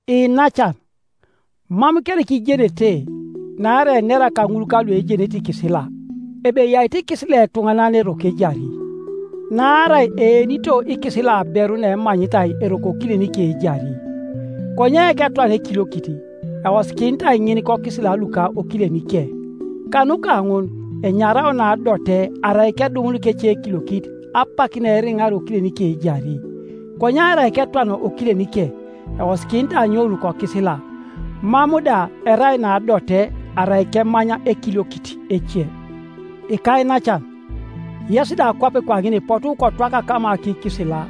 Iinacan, mam kereka ijenete-naarai enera kaŋul kaluejenete ikisila ebe eyaito ikisila etuŋanan eroko ejari? Naarai eenito ikisila aberu naemanyitai eroko okilenike ejari; konye ketwana ekiliokit, eosikinitai ŋin kokisila luka okilenike. Kanuka ŋun enyarao naadote arai kedumun kecekiliokit, apak naeriŋar okilenike ejari. Konye arai ketwana okilenike, eosikinitai anyoun kokisila, mam da erai naadote arai kemany ekiliokit ece. Ikainacan, yes da kwape kwaŋin ipotu kotwakata kama kikisila,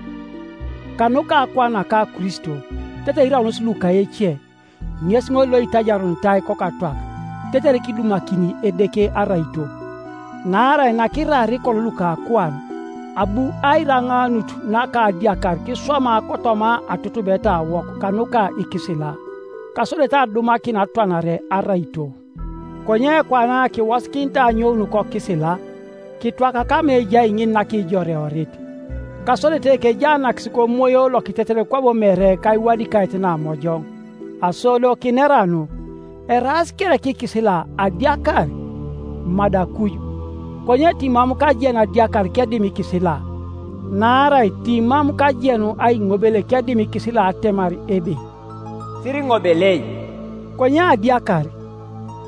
kanuka akuan naka Kristo, tetere iraunos luka ece, ŋes ŋol loitajarunitai kokatwak, tetere kidumakini Edeke araito. Naarai nakiraar kolo luka akuan, abu airaŋaanut naka adiakar kiswama kotoma atutubetawok kanuka ikisila, kasodete adumakin atwanare araito. Konye kwana kiwosikinitai anyoun kokisila, kitwaka kama ejai ŋin nakijoreorit, kasodete kejaanakis komoyo lokitetet kwabo mere kaiwadikaet namojoŋ. Aso do kinera anu? Eraas kereka ikisila adiakar? Madi akuj! Konye timam kajenu adiakar kedim ikisila. Naarai timam kajenu aiŋobel kedim ikisila atemar ebe, “Siriŋobelei.” Konye adiakar,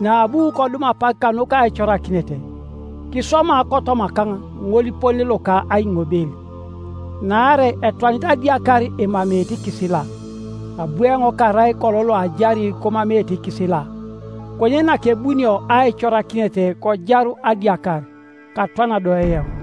naabu kodum apak kanuka aicorakinet, kiswama kotomakaŋ ŋolipone loka aiŋobel, Naarai etwanit adiakar emameete ikisila. Abu eoŋ karai kolo loajari komameete ikisila, konye nakebunio aicorakinet kojaru adiakar, katwana do eoŋ.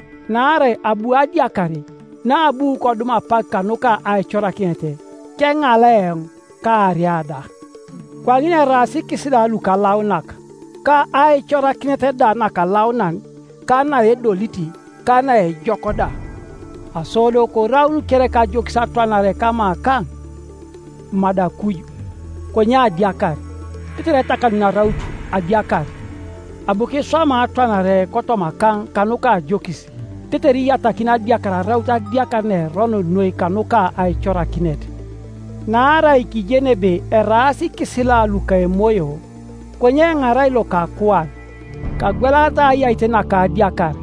Naarai abu adiakar, naabu kodum apak kanuka aicorakinet, keŋala eoŋ, kaaria da. Kwaŋin eraas ikisila lukalaunak, ka aicorakinet da nakalaunan, ka naedolit ka naejok da. Aso do koraun kereka ajokis atwanare kamakaŋ? Madi akuj! Konye adiakar, tetere etakanuni araut adiakar, abu kiswama atwanare kotomakaŋ kanuka ajokis, tetere iyatakin adiakar araut adiakar naerono noi kanuka aicorakinet. Naarai kijeni ebe eraas ikisila luka emoyo; konye eoŋ arai lokakuan, kagwelaritai ayait naka adiakar.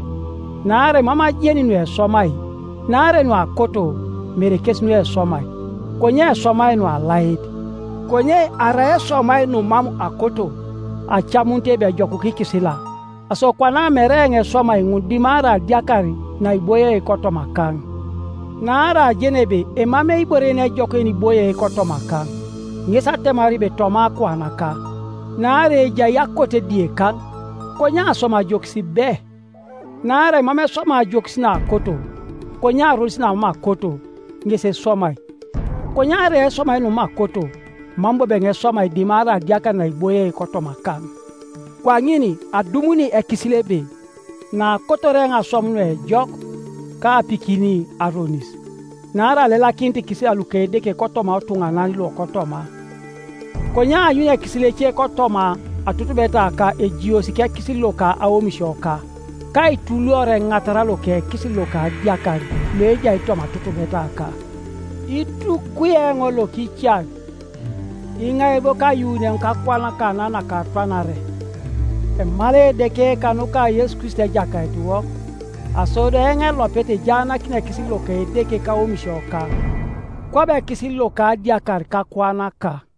Naarai mam ajeni nueswamai, Naarai nuakoto, mere kes nueswamai, konye eswamai nualait. Konye arai eswamai numam akoto, acamunit ebe ejokuka ikisila. Aso kwana mere eoŋ eswamai ŋun dimarai adiakar naiboie kotomakaŋ. Naarai ajeni ebe emamei ibore yenejok yeniboie kotomakaŋ, ŋes atemar ebe toma akuanaka. Naarai ejai akote diekaŋ, konye aswam ajokis be. Naarai mam eswamai ajokis naakoto, konye aronis namam akoto, ŋes eswamai. Konye arai eswamai numam akoto, mam bobo eoŋ eswamai dimarai adiakar naiboie kotomakaŋ. Kwaŋin adumuni ekisil ebe naakotor eoŋ aswam nuejok, kaapikin aronis. Naarai alelakinit ikisila luka Edeke kotoma otuŋanan lokotoma. Konye aanyuni ekisil ece kotoma atutubetaka ejiosi kekisil loka aomisioka, ka aituluor eŋatara loka ekisil loka adiakar loejai toma atutubetaka. Itukwi eoŋ lokican! Iŋai bo kayuuni eoŋ kakuan kana nakatwanare? Emalai Edeke kanuka Yesu Kristo Ejakaitiwok! Aso do eoŋ elopet ejaanakini ekisil loka Edeke kaomisioka, kwabo ekisil loka adiakar kakuanaka.